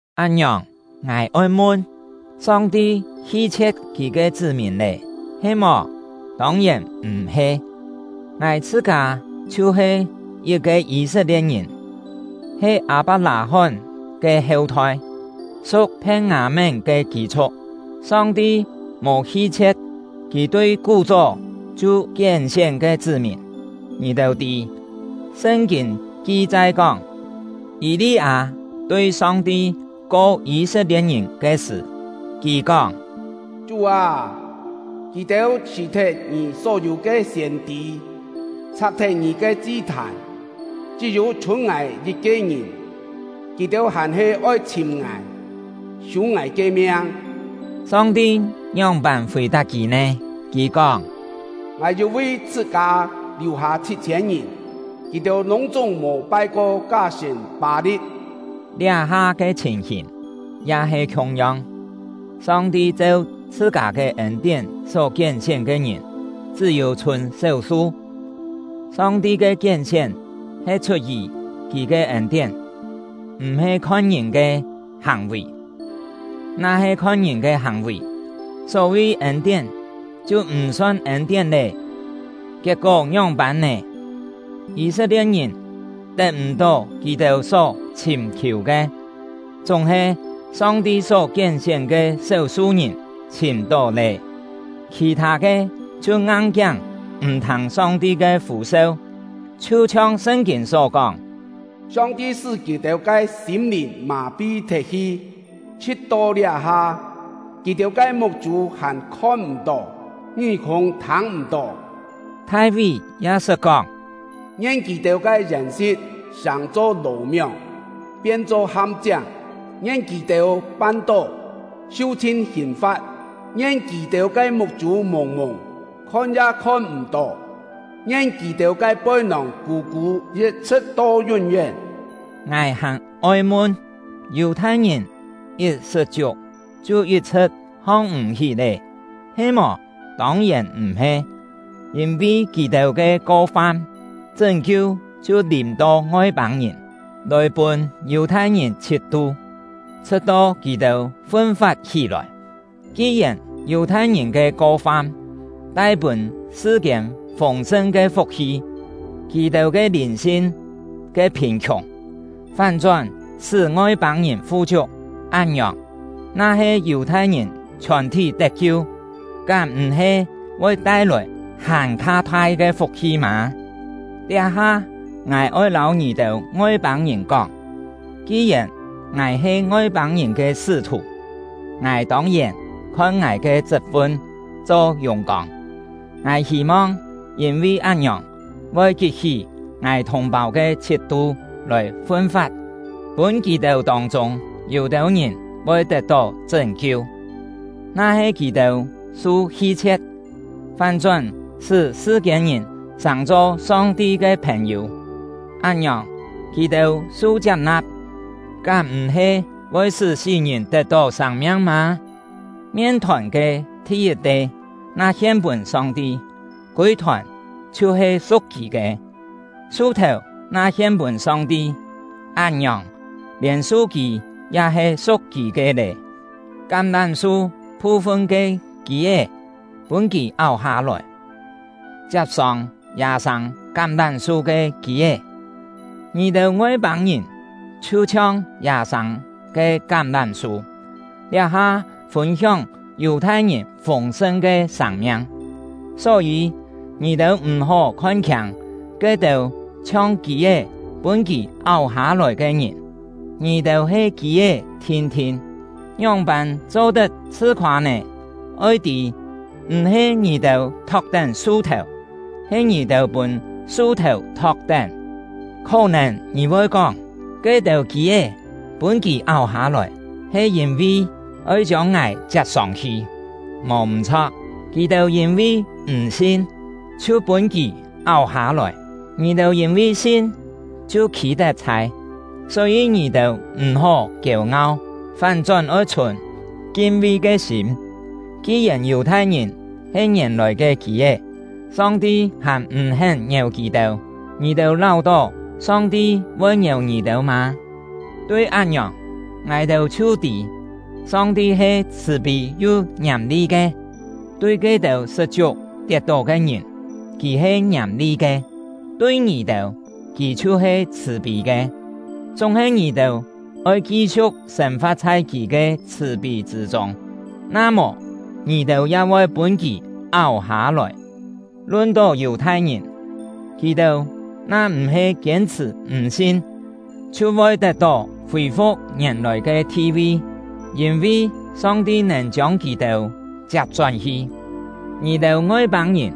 Án-ngiòng, ngài oi mun: Song-ti hi-chhie̍t Kì ke chṳ́-mìn lé, he-mò? Tông-yèn m̀-he! Ngài chhṳ-kâ chhiu-he yit-ke Yî-set-lie̍t-ngìn, he Â-pak-lâ-hón ke heu-thoi, su̍k Phien-ngâ-mén ke kî-chhu̍k. Song-ti mò hi-chhie̍t Kì tui kú-chó chhiu kién-sién ke chṳ́-mìn. Ngì-têu tî, Sṳn-kîn ki-chai kóng, Yî-li-â tui Song-ti ko Yî-set-lie̍t-ngìn ke sṳ̀, kì kóng: “Chú â, kì-têu chhṳ̀-thet Ngì só-yû ke siên-tî, chhak-thet Ngì ke chi-thàn; chṳ́-yû chhûn ngài yit-ke ngìn, kì-têu hàn-he oi chhìm ngài, sû ngài ke miang.” Song-ti ngióng-pân fì-tap kì nè? Kì kóng: “Ngài yû vi chhṳ-kâ liù-hâ chhit-chhiên ngìn, kì-têu lûng-chúng mò pai-ko ká-sṳ̀n Pâ-li̍t.” Liá-ha ke chhìn-hìn ya he khiung-yong: Song-ti cheu chhṳ-kâ ke ên-tién só kién-sién ke ngìn chṳ́-yû chhûn séu-su. Song-ti ke kién-sién he chhut-yì Kì ke ên-tién, m̀-he khon ngìn ke hàng-vì; na-he khon ngìn ke hàng-vì, só-vi ên-tién chhiu m̀ son ên-tién lé. Kiet-kó ngióng-pân nè? Yî-set-lie̍t-ngìn tet m̀-tó kì-têu só chhìm-khiù ke, chúng-he Song-ti só kién-sién ke séu-su ngìn chhìm-tó lé; khì-thâ ke chhiu ngang-kiáng m̀ thâng Song-ti ke fû-seu. Chhiu-chhiong Sṳn-kîn só kóng: “Song-ti sṳ́ kì-têu ke sîm-lìn mà-pi thet-hi; chhṳ̍t-to liá-ha, kì-têu ke muk-chû hàn khon-m̀-tó, ngí-kûng thâng-m̀-tó.” Thai-ví ya sṳt kóng: Ngien kì-têu ke yèn-si̍t sàng-cho lò-mióng, pien-cho ham-chiáng; ngien kì-têu pan-tó, su-chhin hìn-fa̍t! Ngien kì-têu ke muk-chû mùng-mùng, khon ya khon m̀-tó; ngien kì-têu ke poi-nòng kû-kû, yit-chhṳ̍t to yún-yén! Ngài hàn-oi mun: Yù-thai-ngìn yit sṳt-chiuk, chhiu yit-chhṳ̍t hong-m̀-hí lé, he-mò? Tông-yèn m̀-he! Yîn-vi kì-têu ke ko-fam, chṳ́n-kiu chhiu lìm-to Ngoi-pâng-ngìn, lòi pûn Yù-thai-ngìn chhit-tu, chhṳ̍t-to kì-têu fun-fat hí-lòi. Ki-yèn Yù-thai-ngìn ke ko-fam tai pûn sṳ-kiên fûng-sṳn ke fuk-hi, kì-têu lìn-sin ke phìn-khiùng fán-chón sṳ́ Ngoi-pâng-ngìn fu-chiuk; án-ngiòng, na-he Yù-thai-ngìn chhiòn-thí tet-kiu, kám m̀-he voi tai-lòi hàn-kha thai ke fuk-hi mâ? Liá-ha, ngài oi lâu ngì-têu Ngoi-pâng-ngìn kóng: Ki-yèn ngài he Ngoi-pâng-ngìn ke sṳ́-thù, ngài tông-yèn khon ngài ke chṳt-fun cho yùng-kông; ngài hî-mong yîn-vi án-ngiòng voi kit-hí ngài thùng-pâu ke chhit-tu lòi fun-fat, pûn kì-têu tông-chûng yû-têu ngìn voi tet-tó chṳ́n-kiu. Na-he kì-têu su hi-chhie̍t, fán-chón sṳ́ sṳ-kiên-ngìn sàng-cho Song-ti ke phèn-yû; án-ngiòng, kì-têu su chiap-na̍p, kám m̀-he voi sṳ́ sí-ngìn tet-tó sâng-miang mâ? Mien-thòn ke thi-yit-te na hien-pûn Song-ti, kûi-thòn chhiu-he su̍k Kì ke. Su-thèu na hien-pûn Song-ti, án-ngiòng, lièn su-kî ya he su̍k Kì ke lé. Kám-lám-su phu-fun ke kî-é pûn Kì áu-hâ-lòi, chiap-sông yâ-sâng kám-lám-su ke kî-é; ngì-têu Ngoi-pâng-ngìn chhiu-chhiong yâ-sâng ke kám-lám-su, liá-ha fûn-hióng Yù-thai-ngìn fûng-sṳn ke sâng-miang. Só-yî, ngì-têu m̀-hó khon-khiâng ke-têu chhiong kî-é pûn Kì áu-hâ-lòi ke ngìn. Ngì-têu he kî-é thin-thin, ngióng-pân cho-tet chhṳ-khoâ nè? Oi tî, m̀-he ngì-têu thok-tén su-thèu, he ngì-têu pûn su-thèu thok-tén! Khó-nèn ngì voi kóng: “Ke-têu kî-é pûn Kì áu-hâ-lòi, he yîn-vi oi chiông ngài chiap-sông-hi.” Mò m̀-chho̍k. Kì-têu yîn-vi m̀ sin, chhiu pûn Kì áu-hâ-lòi; ngì-têu yîn-vi sin, chhiu khî-tet-chhai. Só-yî ngì-têu m̀-hó kiêu-ngau, fán-chón oi chhùn kin-vi ke sîm. Ki-yèn Yù-thai-ngìn he ngièn-lòi ke kî-é, Song-ti hàn m̀-hén ngièu kì-têu; ngì-têu láu-tó Song-ti voi ngièu ngì-têu mâ? Tui án-ngiòng, ngài-têu chhiu tî, Song-ti he chhṳ̀-pî yu ngiàm-li ke. Tui ke-têu sṳt-chiuk tiet-tó ke ngìn, Kì he ngiàm-li ke; tui ngì-têu, Kì chhiu-he chhṳ̀-pî ke, chúng-he ngì-têu oi ki-siu̍k sên-fa̍t chhai Kì ke chhṳ̀-pî chṳ̂ chûng; na mò, ngì-têu ya voi pûn Kì áu-hâ-lòi. Lun-tó Yù-thai-ngìn, kì-têu na m̀-he kiên-chhṳ̀ m̀-sin, chhiu voi tet-tó fì-fu̍k ngièn-lòi ke thi-vi, yîn-vi Song-ti nèn chiông kì-têu chiap-chón-hi. Ngì-têu Ngoi-pâng-ngìn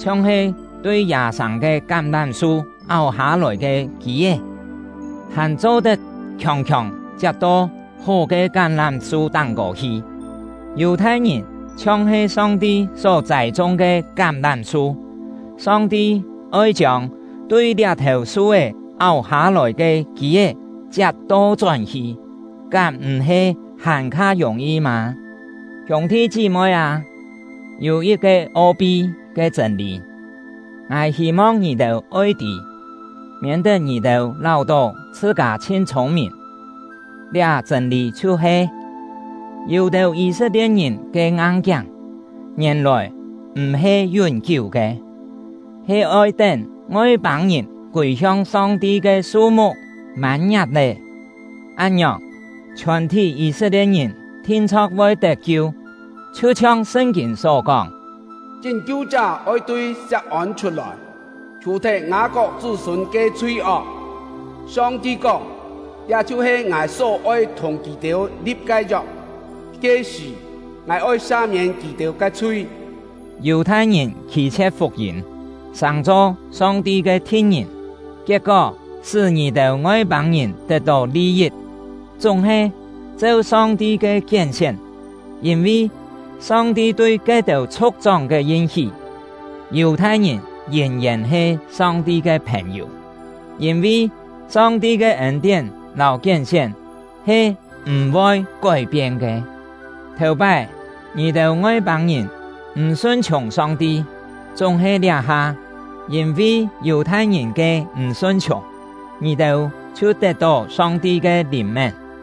chhiong-he tui yâ-sâng ke kám-lám-su áu-hâ-lòi ke kî-é, hàn cho-tet khiòng-khiòng chiap-to hó ke kám-lám-su táng-kô hi; Yù-thai-ngìn chhiong-he Song-ti só châi-chung ke kám-lám-su, Song-ti oi chiông tui liá-thèu su-é áu-hâ-lòi ke kî-é chiap to-chón hi, kám m̀-he hàn-kha yùng-yi mâ? Hiûng-thi chí-moi â, yû yit-ke o-pi ke chṳ̂n-lî, ngài hî-mong ngì-têu oi tî, miên-tet ngì-têu láu-tó chhṳ-kâ chhin chhûng-mìn. Liá chṳ̂n-lî chhiu-he: Yû-têu Yî-set-lie̍t-ngìn ke ngang-kiáng ngièn-lòi m̀-he yún-kiú ke, he oi tén Ngoi-pâng-ngìn kûi-hiong Song-ti ke su-muk mân-ngiak lé. Án-ngiòng, chhiòn-thí Yî-set-lie̍t-ngìn thin-chho̍k voi tet-kiu. Chhiu-chhiong Sṳn-kîn só kóng: Chṳ́n-kiu-chá oi tui Siak-ôn chhut-lòi, chhù-thet Ngâ-kok chṳ́-sûn ke chhui-ok. Song-ti kóng: Liá chhiu-he Ngài só-oi thùng kì-têu li̍p ke yok; ke-sṳ̀, Ngài oi sa-miên kì-têu ke chhui. Yù-thai-ngìn khî-chhie̍t fuk-yîm, sàng-cho Song-ti ke thi̍t-ngìn, kiet-kó sṳ́ ngì-têu Ngoi-pâng-ngìn tet-tó li-yit. Chúng-he, cheu Song-ti ke kién-sién, yîn-vi Song-ti tui ke-têu chhu̍k-chóng ke yin-hí, Yù-thai-ngìn yìn-yèn he Song-ti ke phèn-yû. Yîn-vi Song-ti ke ên-tién lâu kién-sién he m̀-voi kói-pien ke. Thèu-pái, ngì-têu Ngoi-pâng-ngìn m̀ sun-chhiùng Song-ti; chúng-he liá-ha, yîn-vi Yù-thai-ngìn ke m̀ sun-chhiùng, ngì-têu chhiu tet-tó Song-ti ke lìn-mén.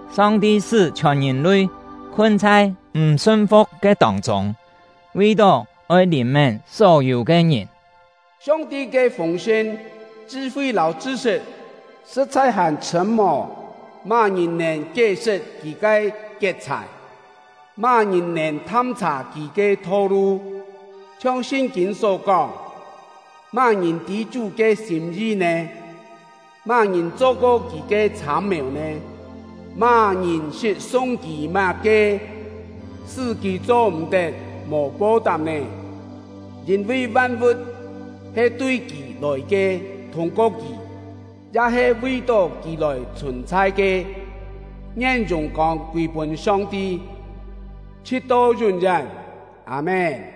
Song-ti sṳ́ chhiòn ngìn-lui khun chhai m̀ sun-fu̍k ke tông-chûng, vi-tó oi lìn-mén só-yû ke ngìn. Song-ti ke fûng-sṳn, chṳ-fi lâu chṳ-sṳt sṳ̍t-chhai hàn chhṳ̂m ô! Má-ngìn nèn kié-sṳt Kì ke kiet-chhài? Má-ngìn nèn tham-chhà Kì ke tho-lu? Chhiong Sṳn-kîn só kóng: Má-ngìn tî Chú ke sîm-yi nè? Má-ngìn cho-ko Kì ke chhâm-mèu nè? Má-ngìn sṳt sung Kì má-ke, sṳ́ Kì cho-m̀-tet mò po-tap nè? Yîn-vi van-vu̍t he tui Kì lòi ke, thûng-ko Kì, ya he vi-tó Kì lòi chhùn-chhai ke. Ngien yùng-kông kûi-pûn Song-ti, chhṳ̍t-to yún-yén! Â-mén.